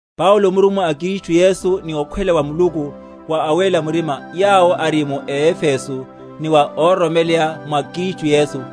Paulo, murummwa a Kristu Yesu, ni okhwela wa Muluku, wa awéla murima yawo ari mu Efeso, ni wa óroromeleya mwa Kristu Yesu: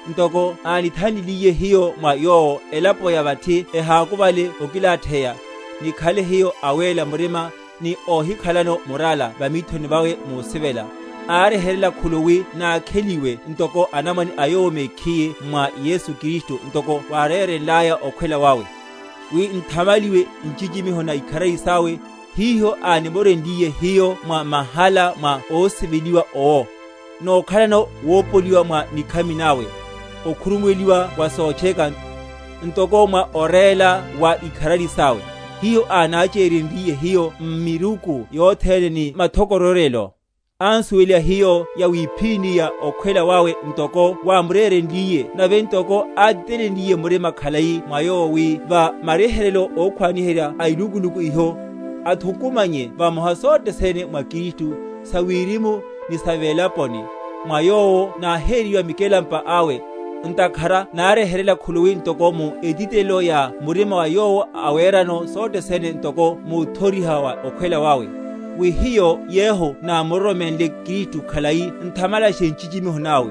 ntoko ánithan?-?liliye hiyo mwa Yowo, elapo ya vathi ehákuvale okilatheya, nikhale hiyo awéla murima, ni ohikhalano murala va mithoni vawe musivela. Ánryeheryela khuluwi nákheliwe ntoko anamwane a Yowo mekhiye mwa Yesu Kristu, ntoko wárérenlaya okhwela wawe, wi nthamaliwe nchichimiho na ikharari sawe, hiho ánimorenliyeno hiyo mwa mahala mwa ósiveliwa owo. Nókhalano wopoliwa mwa nikhami nawe, okhurumuwela wa sotcheka, ntoko mwa oréla wa ikharari sawe, hiho ánachihenryiye hiyo m’miruku yothene, ni mathokororyelo. Ánsuweliha hiyo yawiphíni ya okhwela wawe, ntoko wámurerenliye nave ntoko átitelenliye murima khalai mwa Yowo, wi va maryeheryo ókhwaniherya a ilukuluku iho, athukumanye vamoha sothe sene mwa Kristu, sa wirimu, ni sa velaponi. Mwa Yowo náheriwa mikelampa awe, ntakhara náryeheryela khuluwi ntoko mu etitelelo ya murima ya Yowo awerano sothe sene ntoko muthoriha wa okhwela wawe; wi hiyo yehu námuroromenle Kristu khalai nthamalashe nchichimiho nawe.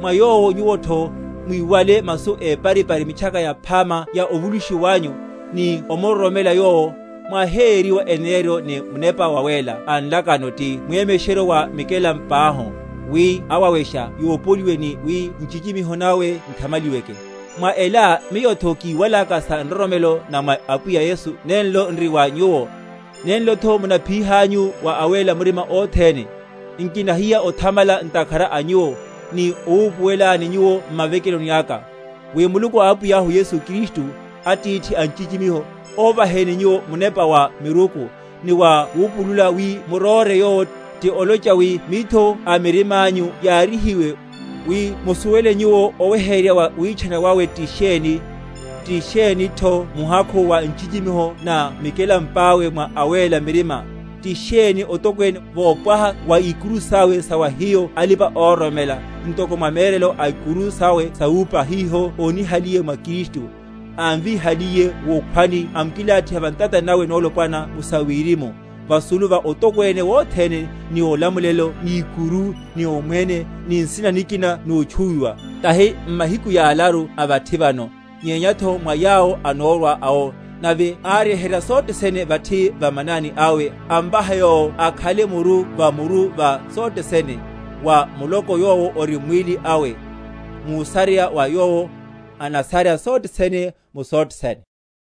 Mwa Yowo nyuwotho, mwiwale masu éparipari, Mitchaka Yaphama ya ovulushiwa wanyu, ni omuroromela Yowo, mwáheyeryiwa eneneryo ni Munepa Wawéla a nlakano, ti mwemesheryo wa mikelampáhu, wi awawenesha yopoliwe, ni wi nchichimiho nawe nthamaliweke. Mwa ela miyotho, kíwalaka sa nroromelo na mwa Apwiya Yesu nenlo n’ri mwa nyuwo, nenlotho munaphiyihanyu wa awéla murima othene, nkinahiya othamala ntakhara a nyuwo, ni owupuwelani nyuwo m’mavekelo aka; wi Muluku a Apwiyahu Yesu Kristu, Atithi a nchichimiho, óvaheni nyuwo munepa wa miruku, ni wa wupulula wi m’muróre Yowo; ti olocha wi mitho a mirimányu yaryihiwe, wi musuwele nyuwo oweheryerya wa witchana wawe ti sheni; ti shenitho muhakhu wa nchichimiho na mikalampáwe mwa awéla murima, ti sheni otokwene wopwaha wa ikuru sawc sa wa hiyo alipa‐ororomela, ntoko mwa mérelo a ikuru sawe sawúpa, hiho ónihaliye mwa Kristu, ámvíhaliye wukhwani amkilathiha va ntatani nawe nolopwana mu sawirimu, vasulu va otokwene wothene, ni olamulelo ni ikuru, ni omwene, ni nsina nikina notchuwiwa, tahi m’mahiku yalaru a vathi vano, nyenyatho mwa yawo anórwa awo; nave áryeherya sothe sene vathi va manani awe, amvaha Yowo akhale muru va muru va sothe sene, wa muloko, yowo ori mwíli awe, músareya mwa Yowo anasarya sothe sene mu sothe sene.